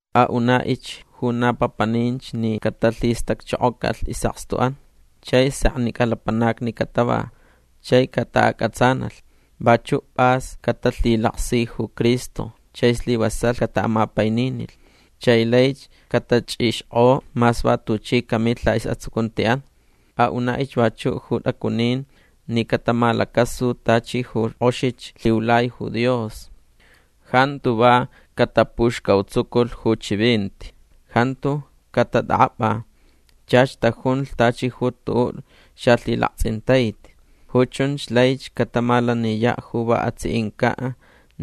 Aʼunaʼich ju na papaninch ni catalhistacchokocalh isʼakstuʼan. Chai seknicʼa lapanacni catava. Chai cataʼacʼatsanalh. Vachuʼ pʼas catalhilaksi ju Cristo chai slivasalh cataʼamapaininilh. Chai laich catachʼixkʼo mas va tuchi camilh laʼisʼatsucuntiʼan. Aʼunaʼich vachuʼ ju tʼacunin ni catamalacasu tachi ju kʼoxich lhiulai ju Dios. Jantu va catapuxcautsuculh ju chivinti. Jantu catatʼakʼapʼa. Chach tajunlh tachi ju tuʼuʼ xalhilaktsʼintaiti. Ju chunch laich catamalaniyaʼ ju va atsiʼincaʼ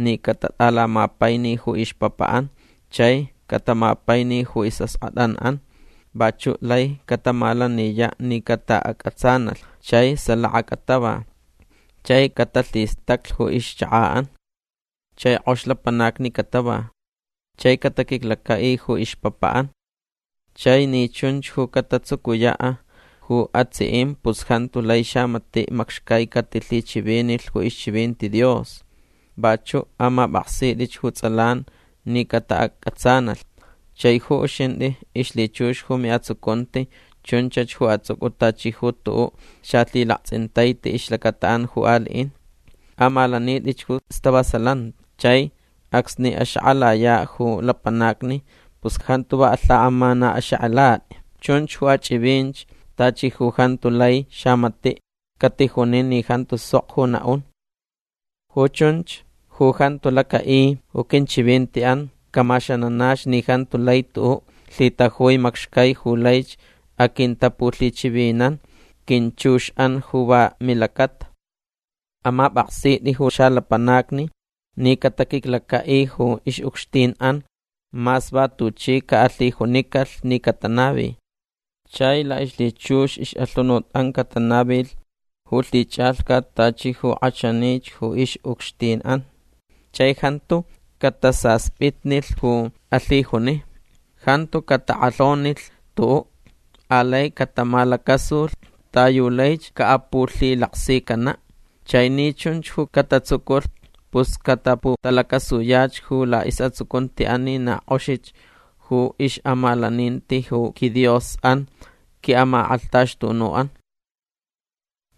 ni catatʼalamapaini ju ixpapaʼan chai catamapaini ju isʼaskʼatʼanʼan. Vachuʼ lai catamalaniyaʼ ni cataʼacʼatsanalh chai salaka catava. Chai catalhistaclh ju ixchakaʼan. Chai kʼox lapanacni catava. Chai cataquiclacaʼi ju ixpapaʼan. Chai ni chunch ju catatsucuyaʼ ju atsiʼin pus jantu lai xamatiʼ macxcai catalhichivinilh ju ixchivinti Dios. Vachuʼ amapʼaksitʼich ju tsʼalan ni cataʼacʼatsanalh. Chai ju uxintʼi ixlhichux ju miʼatsucunti chunchach ju atsʼucʼu tachi ju tuʼuʼ xalhilaktsʼintaiti ixlacataʼan ju aliʼin. Amalanitʼich ju stavasalanti. Chai acsni axakʼalayaʼ ju lapanacni pus jantu va alhakʼamanaʼaxakʼalatʼi. Chunch ju achʼivinch tachi ju jantu lai xamatiʼ catijunin ni jantu sok ju naʼun. Ju chunch ju jantu lacaʼi ju quinchivintiʼan camaxananach ni jantu lai tuʼuʼ lhitajui macxcai ju laich aquintapulhichivinan quinchuxʼan ju va milacata. Amapʼaksitʼi ju xalapanacni ni cataquiclacaʼi ju ixʼucxtinʼan mas va tuchi caʼalhijunicalhch ni catanavi. Chai laʼixlhichux ixʼalhunutʼan catanavilh ju lhichʼalhcat tachi ju kʼachanich ju ixʼucxtinʼan. Chai jantu catasaspitnilh ju alhijuni. Jantu catakʼalhonilh tuʼuʼ. Alai catamalacasulh ta yu laich caʼapulhilaksicanaʼ. Chai ni chunch ju catatsuculh pus cataputalacasuyach ju laʼisʼatsucuntiʼan ni na kʼoxich ju ixʼamalaninti ju quiDiosʼan quiʼamakʼalhtaxtunuʼan.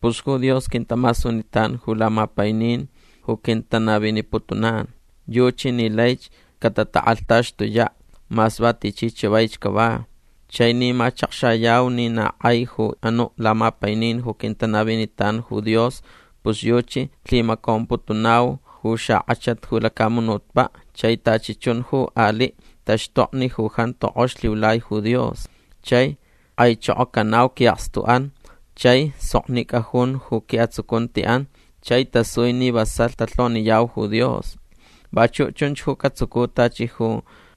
Pus ju Dios quintamasunitan ju lamapainin ju quintanaviniputunan. Yuchi ni laich catatakʼalhtaxtuyaʼ mas va tichi chavaich cava. Chai ni machakxayau ni na kʼai ju anuʼ lamapainin ju quintanavinitan ju Dios pus yuchi lhimacomputunau ju xakʼachat ju lacamunutpaʼ chai tachi chun ju aliʼ taxtokni ju jantu kʼox lhiulai ju Dios. Chai kʼaichokocanau quiʼakstuʼan chai soknicʼa jun ju quiʼatsucuntiʼan chai tasui ni vasalh talhoniyau ju Dios. Vachuʼ chunch ju catsucu tachi ju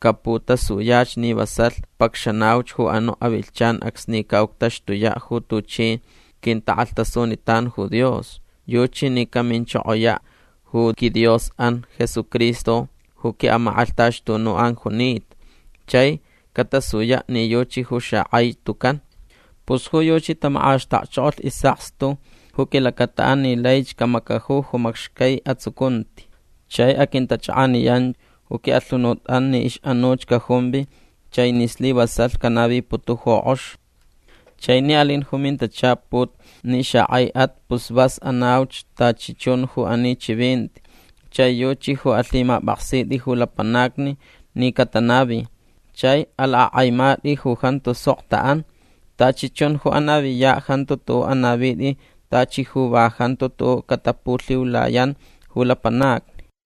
caputasuyach ni vasalh pacxanauch ju anuʼ avilhchan acsni caʼuctaxtuyaʼ ju tuchi quintakʼalhtasunitan ju Dios. Yuchi ni caminchokoyaʼ ju quiDiosʼan Jesucristo ju quiʼamakʼalhtaxtunuʼan junita. Chai catasuyaʼ ni yuchi ju xakʼai tucan. Pus ju yuchi tamakʼaxtakchokolh isʼakstu ju quilacataʼan ni laich camacaju ju macxcai atsucunti. Chai aquintachʼakʼaniyan ju quiʼalhunutʼan ni ixʼanuch cajumvi chai ni slivasalh canaviputu ju kʼox. Chai ni alin ju mintachaput ni xakʼaiʼat pus vas anauch tachi chun ju ani chivinti chai yuchi ju alhimapʼaksitʼi ju lapanacni ni catanavi. Chai alakʼakʼaimatʼi ju jantu sok taʼan. Tachi chun ju anaviyaʼ jantu tuʼuʼ anavitʼi tachi ju va jantu tuʼuʼ catapulhiulayan ju lapanacni.